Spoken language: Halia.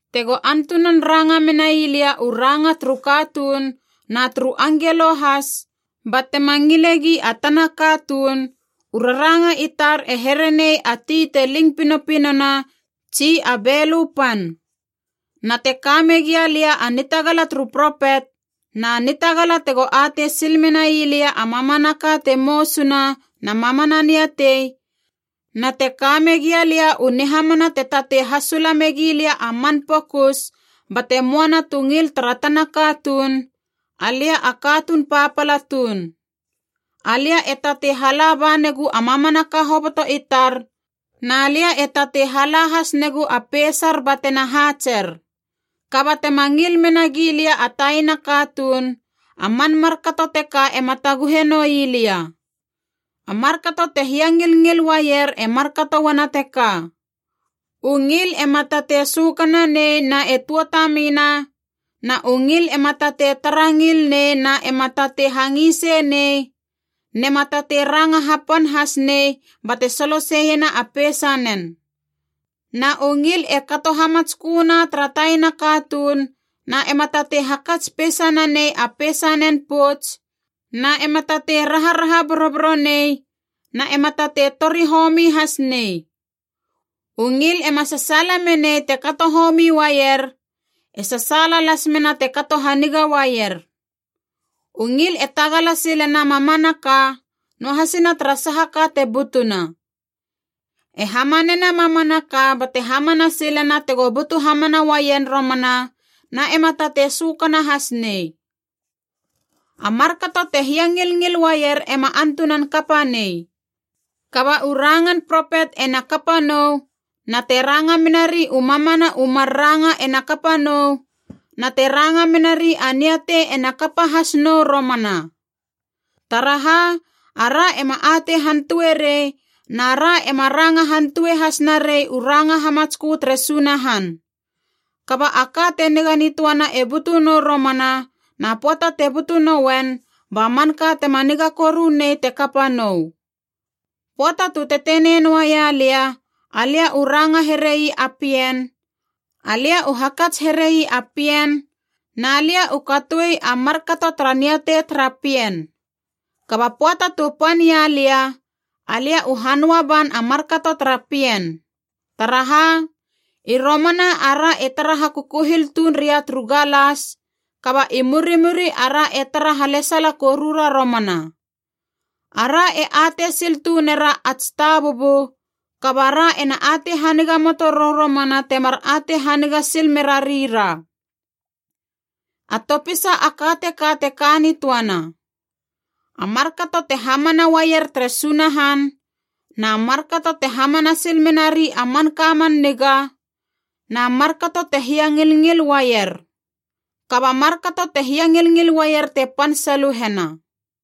Tego antunan ranga menai lia u ranga turu katuun na turu angelo has, ba tema ngile gi a tana katuun, u raranga i tar e here nei a ti te ling pinopinona tsi a belö pan. Na te ka megia lia a nitagala turu propet, na nitagala tego atei sil menai lia a mamanaka te mousuna na mamana niatei, na te ka megia lia u nihamana te tatei hasula megi lia a man pokus bate moana tu ngil tara tana katuun, alia a katuun papala tuun. Alia e tatei hala ba negu a mamanaka hoboto i tar, na lia e tatei hala has negu a peisar batena haatser. Kaba tema ngil mena gi lia a taina katuun, a man markato teka ema taguhe noi lia. A markato te hiangilngil uaier e markato uana teka: u ngil ema tatei sökananei na e tuatamina, na u ngil ema tatei tara ngil nei na ema tatei hangisei nei, nema tatei ranga hapan has nei bate soloseiena a peisanen. Na u ngil e kato hamatsköna tara taina katuun na ema tatei hakats peisa nanei a peisanen pouts, na ema tatei raharaha boroboro nei, na ema tatei tori homi has nei. U ngil ema sasaala menei te kato homi uaier, e sasaala las mena te kato haniga uaier. U ngil e tagala silena mamanaka, noahasina tara saha ka te butuna. E hamanena mamanaka bate hamana silena tego butu hamana uaien romana, na ema tatei sökana has nei. A markato te hiangilngil uaier ema antunan kapa nei. Kaba u rangan propet ena kapa nou, na te ranga menari u mamana u mar ranga ena kapa nou, na te ranga menari a niatei ena kapa has nou romana. Taraha, ara ema atei hantue rei, na ra ema ranga hantue has narei u ranga hamatskö tere Sunahan. Kaba a ka te niga nitöana e butu nou romana, na pöata te butu nouen ba manka tema niga koru nei te kapa nou. Pöata tu tetenei noaia lia, alia u ranga herei a pien, alia u hakats herei a pien, na lia u katoi a markato tara niatei tara pien. Kaba pöata tu pan ia lia, alia u hanöa ban a markato tara pien. Taraha, i romana ara e tara hakukuhil tuun ria turu galas, kaba i murimuri ara e tara halesala korura romana. Ara e atei sil tunera ats tabubu, kaba ra ena atei haniga moto rou romana temar atei haniga sil mera rira. A topisa a ka teka te ka nitöana: a markato te hamana uaier tere Sunahan, na markato te hamana sil menari a manka man niga, na markato te hiangilngil uaier. Kaba markato te hiangilngil uaier te pan saluhena.